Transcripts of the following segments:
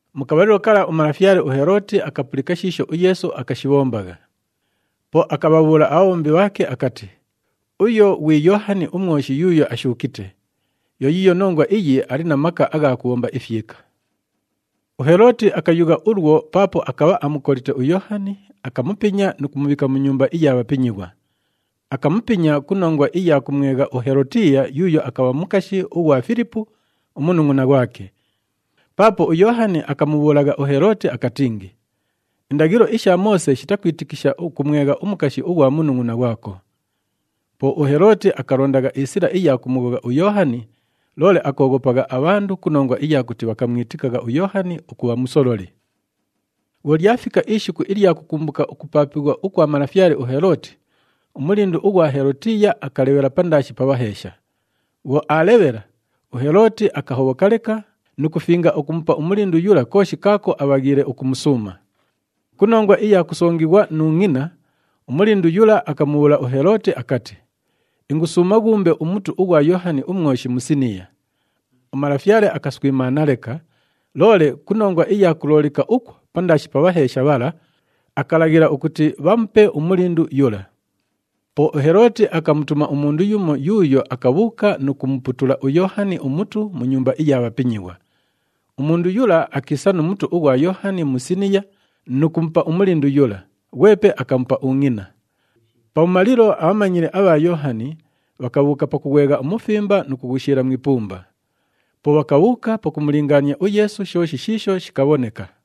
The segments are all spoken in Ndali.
Mu kabhalilo kala umalafyale uHelooti akapulika shiisho uYeesu akashibhombagha. Po akabhabhuula abhabhombi bhaake akati, “Uyo ghwi Yoohani uMwoshi yuuyo ashuukite. Yo yiiyo nongwa iyi ali na maka agha kubhomba ifyika.” UHelooti akayugha ulwo paapo akabha amukolite uYoohani, akamupinya nu kumubhiika mu nyumba iya bhapinyighwa. Akamupinya ku nongwa iya kumwegha uHelotiiya yuuyo akabha mukashi ughwa Filipu, umunungʼuna ghwake. Paapo uYoohani akamubhuulagha uHelooti akatingi, “Indaghilo isha Moose shitakwitikisha ukumwegha umukashi ughwa munungʼuna ghwako.” Po uHelooti akalondagha isila iya kumughogha uYoohani, loole akooghopagha abhandu ku nongwa iya kuti bhakamwitikagha uYoohani ukubha musololi. Bhwo lyafika ishiku ilya kukumbuka ukupaapighwa ukwa malafyale uHelooti, umulindu ughwa Helotiiya akalebhela pandaashi pa bhaheesha. Bhwo aalebhela, uHelooti akahobhoka leka nu kufinga ukumupa umulindu yula kooshi kaako abhaghiile ukumusuuma. Ku nongwa iya kusongighwa nu ngʼina, umulindu yula akamubhuula uHelooti akati, “Ingusuuma ghuumbe umutu ughwa Yoohani uMwoshi mu isiniya.” Umalafyale akaswimaana leka, loole ku nongwa iya kuloolika ukwo pandaashi pa bhaheesha bhala, akalaghila ukuti bhamupe umulindu yula. Po uHelooti akamutuma umundu yumo yuuyo akabhuuka nu kumuputula uYoohani umutu mu nyumba iya bhapinyighwa. Umundu yula akiisa nu mutu ughwa Yoohani mu isiniya nu kumupa umulindu yula, ghwepe akamupa ungʼina. Pabhumalilo, abhamanyili abha Yoohani bhakabhuuka pakughwegha umufimba nu kughushiila mu ipumba. Po bhakabhuuka pakumulingaania uYeesu shooshi shiisho shikabhoneka.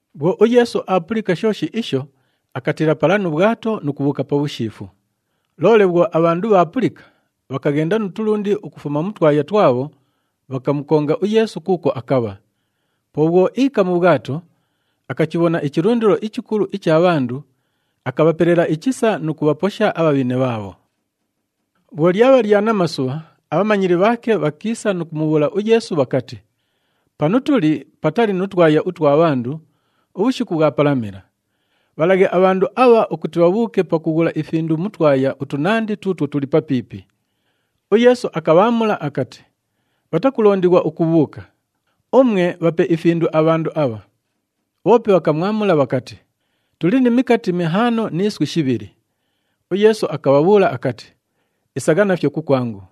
Bhwo uYeesu aapulika shooshi isho, akatiila pala nu bhwato nu kubhuuka pabhushiifu. Loole bhwo abhandu bhaapulika, bhakaghenda nu tulundi ukufuma mu twaya twabho, bhakamukonga uYeesu kuukwo akabha. Po bhwo iika mu bhwato, akachibhona ichilundilo ichikulu icha bhandu, akabhapelela ichisa nu kubhaposha abhabhine bhaabho. Bhwo lyabha lya namasubha, abhamanyili bhaake bhakiisa nu kumubhuula uYeesu bhakati, “Panu tuli patali nu twaya utwa bhandu, ubhushiku bhwapalamila. Bhalaghe abhandu abha ukuti bhabhuuke pakughula ifindu mu twaya utunandi tuutwo tuli papiipi.” UYeesu akabhaamula akati, “Bhatakulondighwa ukubhuuka. Umwe, bhape ifindu abhandu abha.” Bhoope bhakamwamula bhakati, “Tuli ni mikati mihaano ni iswi shibhili.” UYeesu akabhabhuula akati, “Isagha nafyo kukwangu.”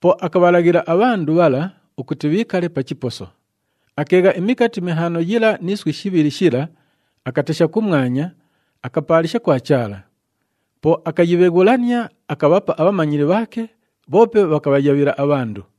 Po akabhalaghila abhandu bhala ukuti bhiikale pa chiposo. Akeegha imikati mihaano yila ni iswi shibhili shila, akatesha kumwanya, akapaalisha kwa Chaala. Po akayibheghulania, akabhapa abhamanyili bhaake, bhoope bhakabhayabhila abhandu.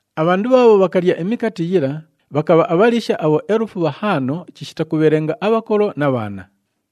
Abhandu bhaabho bhakalya imikati yila, bhakabha abhaliisha abhoelufu bhahaano chishita kubhelenga abhakolo na bhaana.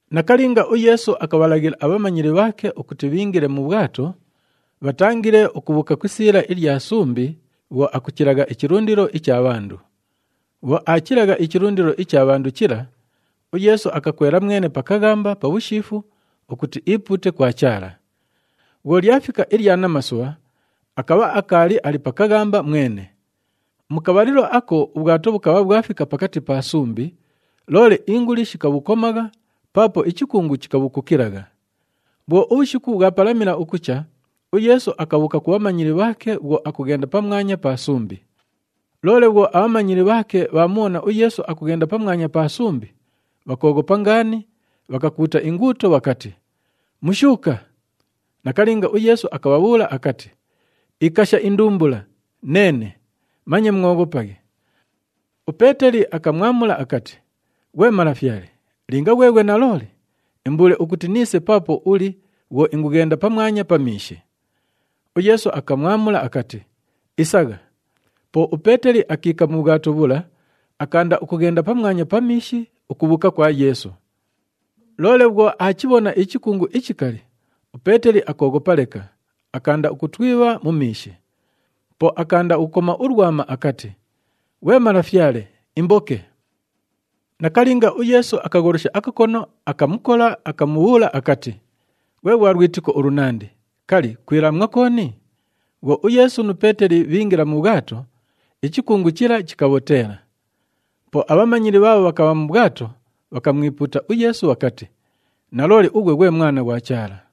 Nakalinga, uYeesu akabhalaghila abhamanyili bhaake ukuti bhiingile mu bhwato, bhatangile ukubhuuka ku isiila ilya sumbi bhwo akuchilagha ichilundilo icha bhandu. Bhwo aachilagha ichilundilo icha bhandu chila, uYeesu akakwela mwene pa kaghamba, pabhushiifu ukuti iipuute kwa Chaala. Bhwo lyafika ilya namasubha, akabha akaali ali pa kaghamba mwene. Mu kabhalilo ako ubhwato bhukabha bhwafika pakati pa sumbi, loole inguli shikabhukomagha paapo ichikungu chikabhukukilagha. Bhwo ubhushiku bhwapalamila ukucha, uYeesu akabhuuka ku bhamanyili bhaake bhwo akughenda pamwanya pa sumbi. Loole bhwo abhamanyili bhaake bhaamubhona uYeesu akughenda pamwanya pa sumbi, bhakooghopa ngaani, bhakakuuta inguuto bhakati, “Mushuuka!” Nakalinga, uYeesu akabhabhuula akati, “Ikasha indumbula, neene. Manye mwoghopaghe.” UPeeteli akamwamula akati, “Ghwe Malafyale, linga ghweghwe nalooli, imbuule ukuti niise paapo uli bhwo ingughenda pamwanya pa miishi.” UYeesu akamwamula akati, “Isagha.” Po uPeeteli akiika mu bhwato bhula, akaanda ukughenda pamwanya pa miishi ukubhuuka kwa Yeesu. Loole bhwo aachibhona ichikungu ichikali, uPeeteli akooghopa leka, akaanda ukutwibha mu miishi. Po akaanda ukukoma ulwama akati, “Ghwe Malafyale, imboke!” Nakalinga, uYeesu akagholosha akakono, akamukola, akamubhuula akati, “Ghwe ghwa lwitiko ulunandi, kali, kwilaamwa kooni?” Bhwo uYeesu nu Peeteli bhiingila mu bhwato, ichikungu chila chikabhoteela. Po abhamanyili bhaabho bhakabha mu bhwato, bhakamwipuuta uYeesu bhakati, “Nalooli, ughwe ghwe Mwana ghwa Chaala!”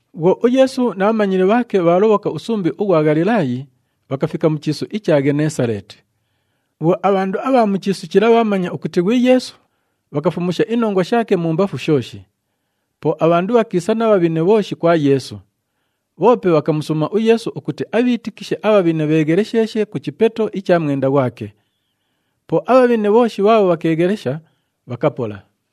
Bhwo uYeesu na bhamanyili bhaake bhaalobhoka usumbi ughwa Ghalilaayi, bhakafika mu chiisu icha Ghenesaleeti. Bhwo abhandu abha mu chiisu chila bhaamanya ukuti ghwi Yeesu, bhakafumusha inongwa shaake mumbafu shooshi. Po abhandu bhakiisa na bhabhine bhooshi kwa Yeesu. Bhoope bhakamusuuma uYeesu ukuti abhiitikishe abhabhine bheeghelesheeshe ku chipeto icha mwenda ghwake. Po abhabhine bhooshi bhaabho bhakeeghelesha, bhakapola.